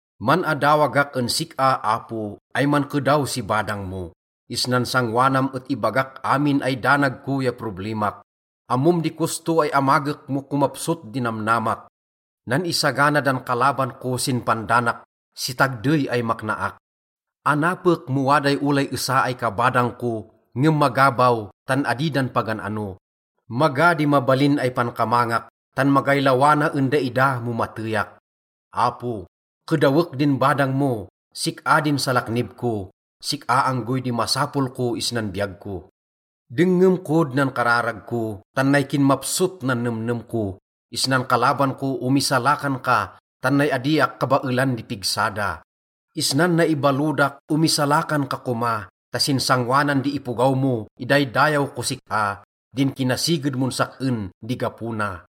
Man-adawagak en sik-a, Apo, ay mankedaw si badang mo. Isnan sangoanam et ibagak amin ay danag ko ya problimak. Ammom di kosto ay amagek mo komapsot di namnamak. Nan-isagana dan kalaban ko sin pandanak si tagdey ay maknaak. Anapek mo waday olay esa ay kabadang ko, ngem maga baw, tan adi dan pagan-ano. Maga di mabalin ay pankamangak, tan magay lawa na en daida mo mateyak. Apo, kedawek din badang mo, sik-a din salaknib ko, sik-a anggoy di masapol ko isnan biyag ko. Dengngem kod nan kararag ko, tan nay kinmapsot nan nemnem ko. Isnan kalaban ko omisalakan ka, tan nay adiak kabaelan di pigsa da. Isnan naibalodak omisalakan ka koma ta sin sangoanan di ipogaw mo idaydayaw kos sik-a, din kinasiged mon sak-en di gapo na.